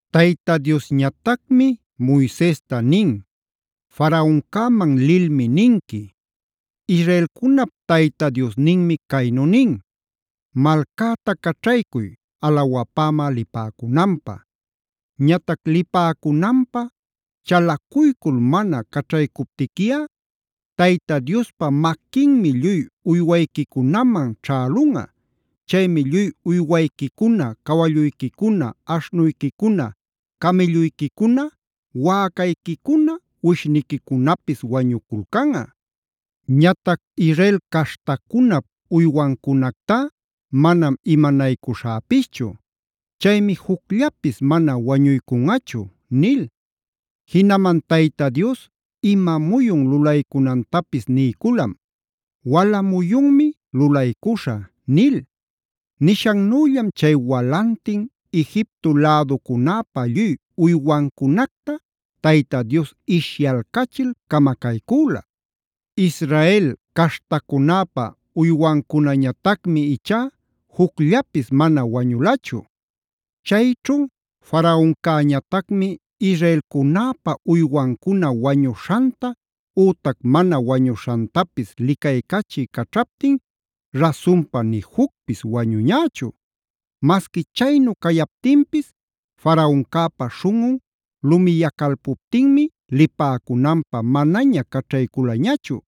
Tayta Diosñatacmi Moisesta nin: “Faraoncäman lilmi ninqui: Israelcunap Tayta Diosninmi caynu nin: ‘Malcäta caćhaycuy alawapämä lipäcunanpä. Ñatac lipäcunanpä chalacuycul mana caćhaycuptiquiꞌa, Tayta Diospa maquinmi lluy uywayquicunaman ćhälunꞌa. Chaymi lluy uywayquicuna cawalluyquicuna, aśhnuyquicuna, camïlluyquicuna, wäcayquicuna, uwishniquicunapis wañuculcanꞌa. Ñatac Israel caśhtacunap uywancunactá manam imanaycuśhäpischu. Chaymi jucllapis mana wañuycunꞌachu’” nil. Jinaman Tayta Dios ima muyun lulaycunantapis niyculam: “Wala muyunmi lulaycuśhä” nil. Nishannüllam chay walantin Egipto läducunäpä lluy uywancunacta Tayta Dios ishyalcachil camacaycüla. Israel caśhtacunäpa uywancunañatacmi ichá jucllapis mana wañulachu. Chayćhu Faraoncäñatacmi israelcunäpa uywancuna wañuśhanta ütac mana wañuśhantapis licaycachï caćhaptin rasunpa ni jucpis wañuñächu. Masqui chaynu cayaptinpis Faraoncäpa śhunꞌun lumiyacalpuptinmi lipäcunanpä manaña caćhayculañachu.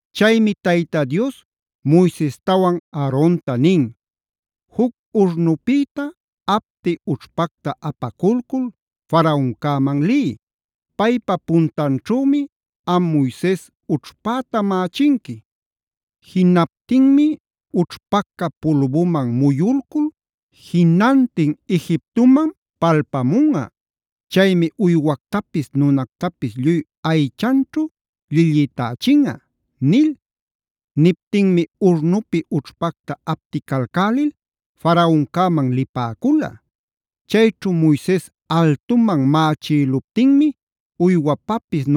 Chaymi Tayta Dios Moisestawan Aaronta nin: “Juc urnupïta apti ućhpacta apaculcul Faraoncäman liy. Paypa puntanćhümi am Moises ućhpäta mächinqui. Jinaptinmi ućhpaca pulbuman muyulcul jinantin Egiptoman palpamunꞌa. Chaymi uywactapis nunactapis lluy aychanćhu llillïtächinꞌa” nil. Niptinmi urnupi ućhpacta apticalcälil Faraoncäman lipäcula. Chayćhu Moises altuman mächïluptinmi uywapapis,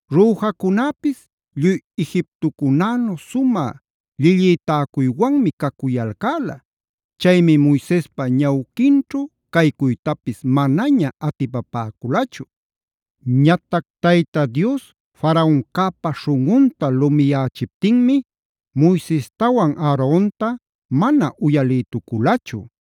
Rüjacunäpis lluy Egiptocunänu sumä llillïtäcuywanmi cacuyalcäla. Chaymi Moisespa ñawquinćhu caycuytapis manaña atipapäculachu. Ñatac Tayta Dios Faraoncäpa śhunꞌunta lumiyächiptinmi Moisestawan Aaronta mana uyalïtuculachu.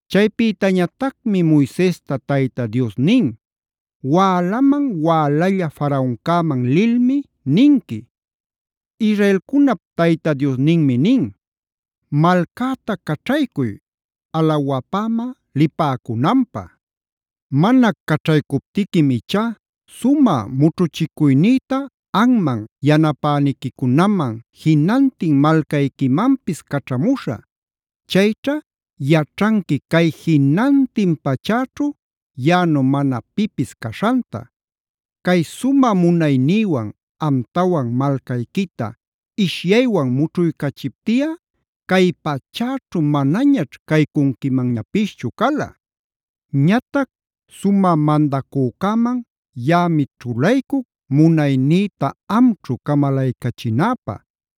Chaypïtañatacmi Moisesta Tayta Dios nin: “Wälaman wälalla Faraoncäman lilmi ninqui: Israelcunap Tayta Diosninmi nin: ‘Malcäta caćhaycuy alawapämä lipäcunanpä. Mana caćhaycuptiquim ichá sumä mućhuchicuynïta anman, yanapäniquicunaman, jinantin malcayquimanpis caćhamuśhä. Chayćha yaćhanqui cay jinantin pachäćhu yaꞌanu mana pipis caśhanta. Cay sumä munaynïwan amtawan malcayquita ishyaywan mućhuycachiptiꞌa cay pachäćhu manañaćh caycunquimanñapischu cala. Ñatac sumä mandacüman yaꞌami ćhulaycuc munaynïta amćhu camalaycachinäpä;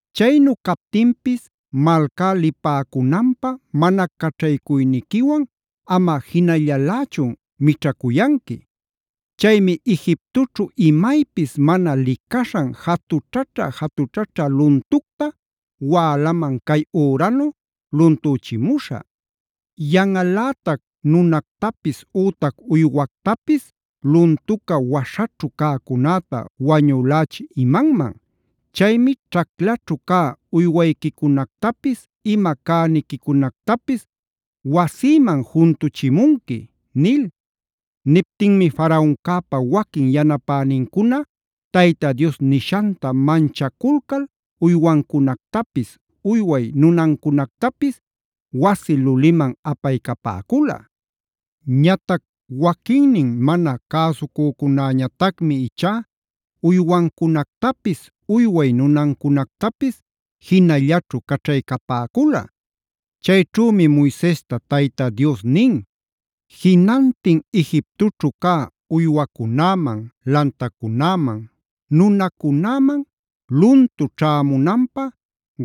Chaynu captinpis malcá lipäcunanpä mana caćhaycuyniquiwan amꞌa jinallalächun mićhacuyanqui. Chaymi Egiptoćhu imaypis mana licaśhan jatućhaćha-jatućhaćha luntucta wälaman cay üranu luntüchimuśhä. Yanꞌalätac nunactapis ütac uywactapis luntuca waśhaćhu cäcunäta wañülächï imanman. Chaymi ćhaclaćhu cä uywayquicunactapis, ima cäniquicunactapis wasiman juntuchimunqui’” nil. Niptinmi Faraoncäpa waquin yanapänincuna Tayta Dios nishanta manchaculcal uywancunactapis uyway nunancunactapis wasi luliman apaycapäcula. Ñatac waquinnin mana cäsucücunäñatacmi ichá uywancunactapis, uyway nunancunactapis jinallaćhu caćhaycapäcula. Chayćhümi Moisesta Tayta Dios nin: “Jinantin Egiptoćhu cä uywacunäman, lantacunäman, nunacunäman luntu ćhämunanpä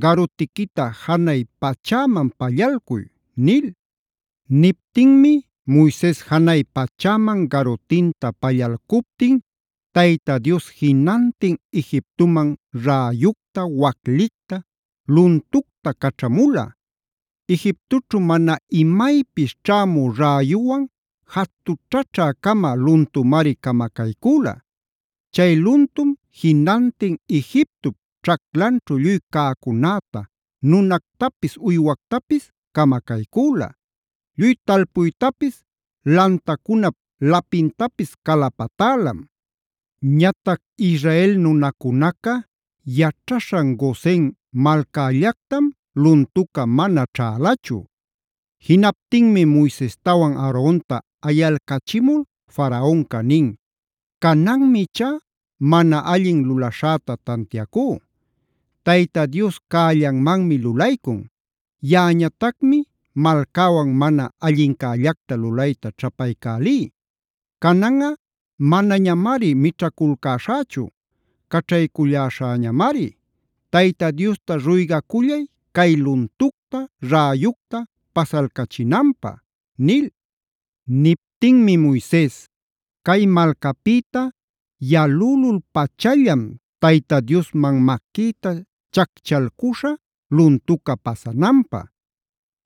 garutiquita janay pachäman pallalcuy” nil. Niptinmi Moises janay pachäman garutinta pallalcuptin Tayta Dios jinantin Egiptoman räyucta, waclicta, luntucta caćhamula. Egiptoćhu mana imaypis ćhämü räyuwan jatućhaćhä-cama luntumaric camacaycüla. Chay luntum jinantin Egiptop ćhaclanćhu lluy cäcunäta, nunactapis, uywactapis camacaycüla. Lluy talpuytapis lantacunap lapintapis calapatälam. Ñatac Israel nunacunaca yaćhaśhan Gosen malcällactam luntuca mana ćhälachu. Jinaptinmi Moisestawan Aaronta ayalcachimul Faraonca nin: “Cananmi ichá mana allin lulaśhäta tantiacú. Tayta Dios cällanmanmi lulaycun. Yaꞌañatacmi malcäwan mana allincällacta lulayta ćhapaycälí. Cananꞌa manañamari mićhaculcäśhächu; caćhayculläśhäñamari. Tayta Diosta ruygacullay cay luntucta, räyucta pasalcachinanpä” nil. Niptinmi Moises: “Cay malcapïta yalülul-pachallam Tayta Diosman maquïta chacchalcuśhä luntuca pasananpä.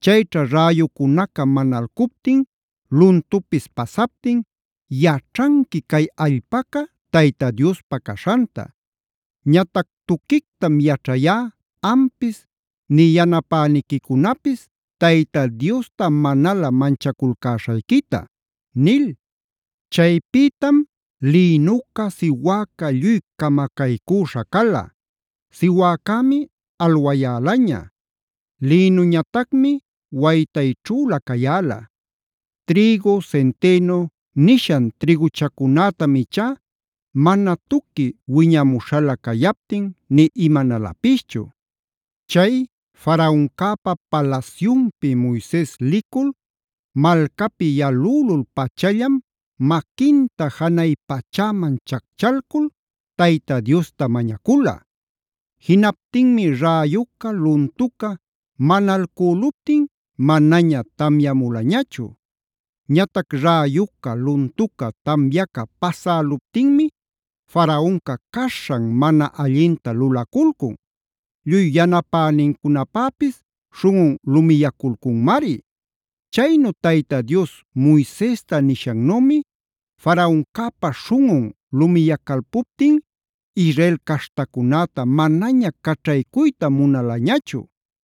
Chayćha räyucunaca manalcuptin luntupis pasaptin yaćhanqui cay allpaca Tayta Diospa caśhanta. Ñatac tuquictam yaćhayá ampis nï yanapäniquicunapis Tayta Diosta manalä manchaculcäśhayquita” nil. Chaypïtam lïnuca, siwäca lluy camacaycüśha cala; siwäcämi alwayälaña, lïnuñatacmi waytayćhülä cayäla. Trïgu, centeno nishan trïguchacunätam ichá mana tuqui wiñämuśhalä cayaptin nï imanalapischu. Chay Faraoncäpa palasyunpi Moises licul, malcapi yalülul-pachallam maquinta janay pachäman chacchalcul Tayta Diosta mañacula. Jinaptinmi räyuca luntuca manalcüluptin manaña tamyamulañachu. Ñatac räyuca, luntuca, tamyaca pasäluptinmi Faraonca caśhan mana allinta lulaculcun. Lluy yanapänincunapapis śhunꞌun lumiyaculcunmari. Chaynu Tayta Dios Moisesta nishannümi Faraoncäpa śhunꞌun lumiyacalpuptin Israel caśhtacunäta manaña caćhaycuyta munalañachu.